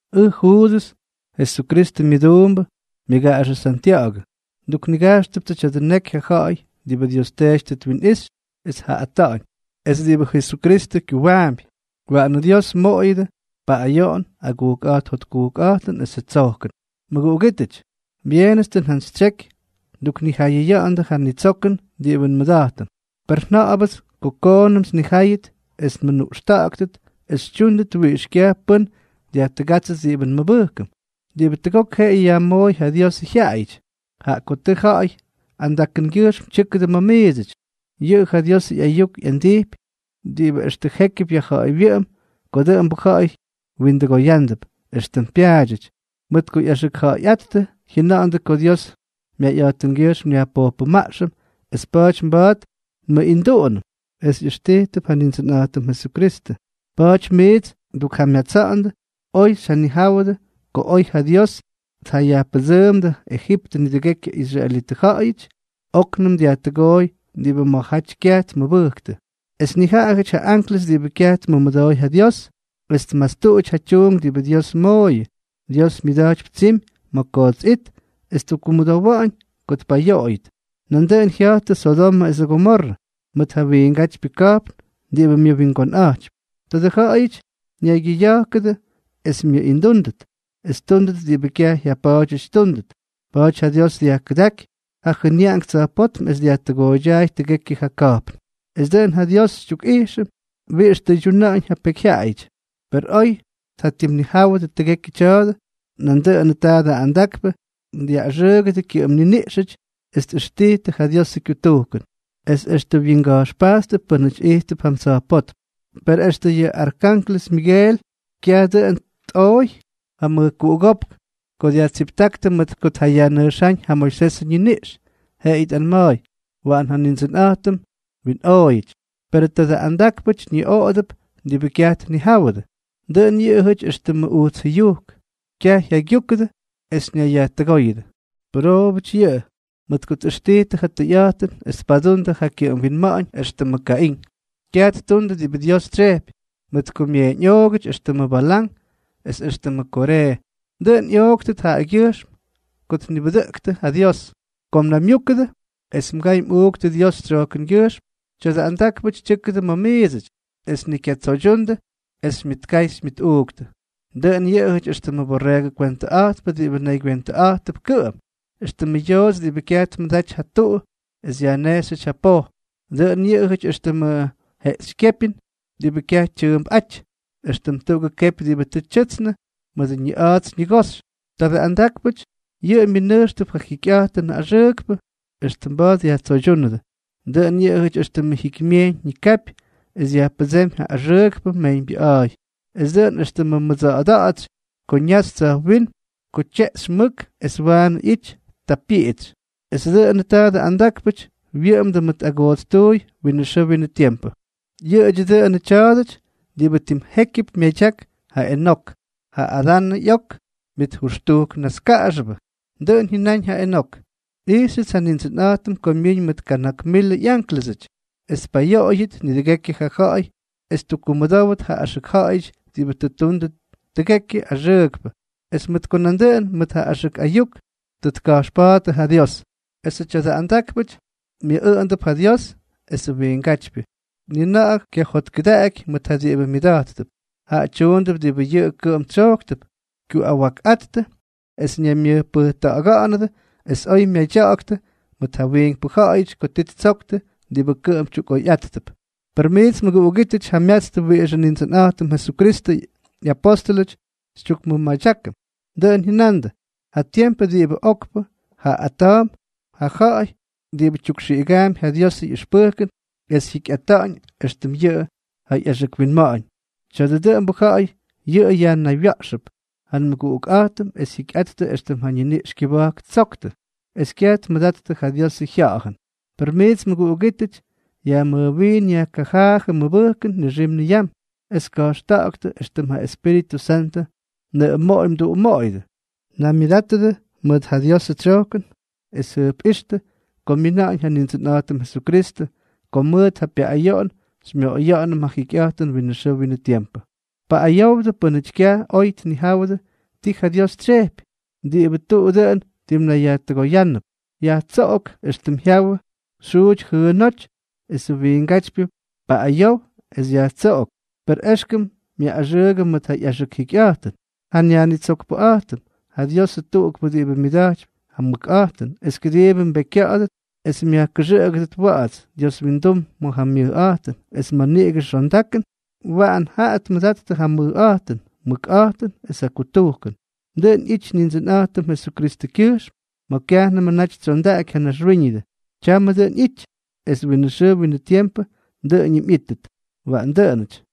Ʉj Juudʉs, Jesukristʉ myʉduumbʉ, myʉgaꞌaxʉ Santya̱ꞌa̱gʉ. Nduknigajxtʉptsʉ tya̱dʉ neky ja ja̱ꞌa̱y diꞌibʉ Dios Teety tʉ twinꞌixy es tjaꞌaꞌꞌata̱ꞌa̱ñ, es diꞌibʉ Jesukristʉ kyuwaampy. Waꞌanʉ Dios mmoꞌoyʉdʉ paꞌꞌayoꞌon, agujkꞌa̱jt jotkujkꞌa̱jtʉn esʉ tsojkʉn. Mʉguꞌugítʉty, byeenʉts tʉ njantsytsyeky nduknijayʉya̱ꞌa̱ndʉ ja nitsokʉn diꞌibʉ nmʉda̱jtʉm. Per nja̱ꞌa̱bʉts ko koonʉmts nnijáyʉt es nmʉnuꞌxta̱ꞌa̱ktʉt es xytyúndʉt wiꞌix kyaj pʉ́n dyajtʉgátsʉt diꞌibʉ nmʉbʉjkʉm, diꞌibʉ tʉgok jeꞌeyʉ yajmooy ja Diosʉ jyaꞌayʉty. Jaꞌa ko tʉ ja ja̱ꞌa̱y andakʉngyʉjxm tyʉ́kʉdʉ ma̱ miidsʉty. Yʉꞌʉ ja Diosʉ ꞌyayuk ꞌyandijpy diꞌibʉ extʉ jékyʉp ma̱ yajja̱a̱ywyʉꞌʉm ko dʉꞌʉmbʉ ja̱ꞌa̱y windʉgoyándʉp, éxtʉm pyaadyʉty. Mʉt ko ꞌyaxʉkja̱ꞌa̱yꞌáttʉ, jyʉnandʉ ko Dios myayꞌa̱jtʉngyʉjxm nyajpojpʉmaꞌxʉm, es pa̱a̱ty mba̱a̱t nmʉꞌinduꞌunʉm, es ꞌyʉxtijtʉp ja Nindsʉnꞌa̱jtʉm Jesukristʉ. Pa̱a̱ty miits ndukjamyatsa̱ꞌa̱ndʉ, oy xyjanijáwʉdʉ, ko oy ja Dios tjayajpʉdsʉʉmdʉ Ejiptʉ nidʉgekyʉ israelitʉ ja̱ꞌa̱yʉty, óknʉm dyajkutʉgooy diꞌibʉ ma̱jaty kyaj tmʉbʉjktʉ. Es nijaꞌajʉty ja anklʉs diꞌibʉ kyaj tmʉmʉdooy ja Dios, es tmastuty ja tyuunk diꞌibʉ Dios mooyʉ, Dios myʉda̱jtypy tsimy ma̱ koots it es ttukkumʉdowa̱ꞌa̱ñ ko ttpayoꞌoyʉt. Nandʉꞌʉn jya̱jtʉ Sodomʉ esʉ Gomorrʉ mʉt ja wiingátypyʉ ka̱jpn diꞌibʉ myʉwingonꞌa̱jtypy. Tadʉ ja̱ꞌa̱yʉty naygyʉꞌʉya̱jkʉdʉ es myʉꞌindúndʉt, es ttúndʉt diꞌibʉ kyaj jyapa̱a̱dyʉty ttúndʉt. Pa̱a̱ty ja Dios dyajkʉdáky ja jʉnyaꞌank tsa̱jpótm es dyajtooydyaay tʉgekyʉ ja ka̱jpn. Es dʉꞌʉn ja Dios xytyukꞌijxʉm wiꞌix ttʉydyuna̱ꞌa̱ñ ja pekyjyaꞌayʉty. Per oy tjatimnijáwʉdʉ tʉgekyʉ tya̱a̱dʉ, nandʉꞌʉnʉ tadʉ andakpʉ dyaꞌꞌaxʉʉgʉdʉ kyʉꞌʉm niniꞌxʉty es tꞌʉxtijtʉ ja Diosʉ kyutujkʉn, es extʉ wyinga̱jxpajttʉp pʉ́nʉty ijttʉp jam tsa̱jpótm. Per extʉ yʉ arkanklʉs Migel kyaj dʉꞌʉn tꞌooy ja mʉjkuꞌugópk ko dyajtsiptáktʉ mʉt ko tjayajnʉjxáñ ja Moisesʉ ñiniꞌx, jeꞌeyʉ tꞌanma̱a̱y: “Waꞌan ja Nindsʉnꞌa̱jtʉm mwinꞌooyʉty.” Perʉ tadʉ andákpʉty ñiꞌoꞌodʉp diꞌibʉ kyaj tnijáwʉdʉ. Dʉꞌʉn yʉꞌʉjʉty éxtʉmʉ ujts jʉyujk, kyaj jyaygyúkʉdʉ es ñayyajtʉgóyʉdʉ. ¡Pʉroobʉty yʉꞌʉ!, mʉt ko tꞌʉxtijtʉ ja tʉyꞌa̱jtʉn es tpadundʉ ja kyʉꞌʉm winma̱ꞌa̱ñ éxtʉmʉ Kaín. Kyaj ttundʉ diꞌibʉ Dios tsyejpy, mʉt ko myeeñꞌoogʉty éxtʉmʉ Balán, es éxtʉmʉ Koree, dʉꞌʉn ꞌyooktʉt jaꞌagyʉjxm ko tnibʉdʉꞌʉktʉ ja Dios. Ko mnaymyúkʉdʉ es mgay mꞌuuktʉ Dios tsyojkʉngyʉjxm, tya̱dʉ andákpʉty tyʉ́kʉdʉ ma̱ miidsʉty, es ni kyatsoydyundʉ es xymyʉtkay xymyʉtꞌuuktʉ. Dʉꞌʉn yʉꞌʉjʉty éxtʉmʉ borreegʉ kwentʉꞌa̱jtpʉ diꞌibʉ naygywentʉꞌa̱jtʉp kʉꞌʉm, éxtʉmʉ yoots diꞌibʉ kyaj tmʉdaty ja tuu es yajnejxyʉty ja poj, dʉꞌʉn yʉꞌʉjyʉty éxtʉmʉ jeꞌxykyépyʉn diꞌibʉ kyaj tyʉʉmpꞌáty, éxtʉm tuꞌugʉ kepy diꞌibʉ tʉ tyʉtsnʉ mʉdʉ ñiꞌa̱a̱ts ñigoxy. Tadʉ andákpʉty, yʉꞌʉ myʉnʉjxtʉp ja jikyꞌa̱jtʉnʉ axʉʉkpʉ extʉ mba̱a̱t yajtsoydyúnʉdʉ. Dʉꞌʉn yʉꞌʉjʉty éxtʉmʉ jikymyejyñ ñikapy es dyajpʉdsémy ja axʉʉkpʉ mejyñbyʉꞌa̱a̱y, es nandʉꞌʉn éxtʉmʉ mʉdsa̱ꞌa̱da̱ꞌa̱tsy ko ñaxy tsa̱jwínm ko tyeꞌxy mʉk es waanʉ ꞌyity, ta pyiꞌitsy, esʉ dʉꞌʉnʉ tadʉ andákpʉty wyʉꞌʉmdʉ mʉk agootstuuy winʉ xʉʉ winʉ tiempʉ. Yʉꞌʉdyʉ dʉnʉ tya̱a̱dʉty diꞌibʉ tim jékyʉp myadyak ja Enok, ja Adanʉ ꞌyok myʉjʉxtujk naskaꞌaxʉbʉ. Dʉꞌʉn jyʉnáñ ja Enok: “Nꞌijxʉts ja Nindsʉnꞌa̱jtʉm ko myiñ mʉt kana̱k milʉ ꞌyánklʉsʉty, es tpayoꞌoyʉt nidʉgekyʉ ja ja̱ꞌa̱y es tkumʉdówʉt ja axʉk ja̱ꞌa̱yʉty diꞌibʉ tʉ ttundʉ tʉgekyʉ axʉʉkpʉ, es mʉt ko nandʉꞌʉn mʉt ja axʉk ayuk tʉ tka̱jxpa̱a̱ttʉ ja Dios.” Esʉ tya̱dʉ andákpʉty myʉꞌꞌʉꞌʉndʉp ja Dios esʉ wiingátypyʉ, ni na̱ꞌa̱ kyajotkʉdaꞌaky mʉt ja diꞌibʉ myʉda̱jttʉp. Jaꞌa tyuundʉp diꞌibʉ yʉꞌʉ kʉꞌʉm tsyojktʉp, kyuꞌawakꞌáttʉ es ñayyajmʉjpʉjta̱ꞌa̱ga̱ꞌa̱nʉdʉ, es oy myadya̱ꞌa̱ktʉ mʉt ja wiinkpʉ ja̱ꞌa̱yʉty ko ti ttsoktʉ diꞌibʉ kʉꞌʉm tyukꞌoyꞌáttʉp. Per miits mʉguꞌugítʉty, jamyatstʉ wiꞌixʉ Nindsʉnꞌa̱jtʉm Jesukristʉ ꞌyapóstʉlʉty xytyukmʉmadyákʉm. Dʉꞌʉn jyʉnandʉ: “Ja tiempʉ diꞌibʉ tim okpʉ jaaꞌꞌata̱a̱mp ja ja̱ꞌa̱y diꞌibʉ tyukxiꞌigaampy ja Diosʉ ꞌyʉxpʉjkʉn es jyikyꞌata̱ꞌa̱ñ éxtʉm yʉꞌʉ ja ꞌyaxʉk winma̱ꞌa̱ñ.” Tya̱a̱dʉ dʉꞌʉmbʉ ja̱ꞌa̱y yʉꞌʉ yajnaywya̱ꞌxʉp ja nmʉguꞌukꞌa̱jtʉm es jyikyꞌattʉ éxtʉm ja ñiniꞌx kyʉba̱jk ttsoktʉ, es kyaj tmʉdattʉ ja Diosʉ Jya̱ꞌa̱jʉn. Per miits mʉguꞌugítʉty, yajmʉjwiin yajkajaajʉ mmʉbʉjkʉn nixim niyam, es ka̱jxta̱ꞌa̱ktʉ éxtʉm ja Espíritʉ Santʉ mnʉꞌʉmoꞌoy mduꞌumoꞌoyʉdʉ. Naymyʉdátʉdʉ mʉt ja Diosʉ tsyojkʉn es jʉjpꞌíxtʉ ko myina̱ꞌa̱ñ ja Nindsʉnꞌa̱jtʉm Jesukristʉ, ko mʉt ja pyaꞌꞌayoꞌon xymyoꞌoya̱ꞌa̱nʉm ja jikyꞌa̱jtʉn winʉ xʉʉ winʉ tiempʉ. Paꞌꞌayowdʉ pʉ́nʉty kyaj oy tnijáwʉdʉ ti ja Dios tsyejpy. Diꞌibʉ tʉʉ dʉn timnayyajtʉgoyánʉnʉp, yajtsoꞌok éxtʉm jyawʉ xyjuuty jʉʉnóty; esʉ wiingátypyʉ paꞌꞌayow es yajtsoꞌok, per éxkʉm myaꞌꞌaxʉʉgʉdʉ mʉt ja ꞌyaxʉk jikyꞌa̱jtʉn. Ja nYajnitsokpʉꞌa̱jtʉm, ja Diosʉ tuꞌukpʉ diꞌibʉ myʉda̱jtypy ja mʉkꞌa̱jtʉn es kʉdiibʉ mbekykya̱ꞌa̱dʉt es myajkʉxʉꞌʉgʉdʉt wa̱ꞌa̱ts Dios wyindum ma̱ ja myʉjꞌa̱jtʉn, es mʉt niꞌigʉ xondakʉn, waꞌan jaꞌa tmʉdattʉ ja mʉjꞌa̱jtʉn, mʉkꞌa̱jtʉn, es ja kutujkʉn. Dʉꞌʉn ꞌyijty Nindsʉnꞌa̱jtʉm Jesukristʉkyʉjxm ma̱ kyajnʉmʉ naty tsyondaꞌaky ja naxwíñʉdʉ, tyamʉ dʉꞌʉn ꞌyity, es winʉ xʉʉ winʉ tiempʉ dʉꞌʉñʉm ꞌyítʉt. Waꞌan dʉꞌʉnʉty.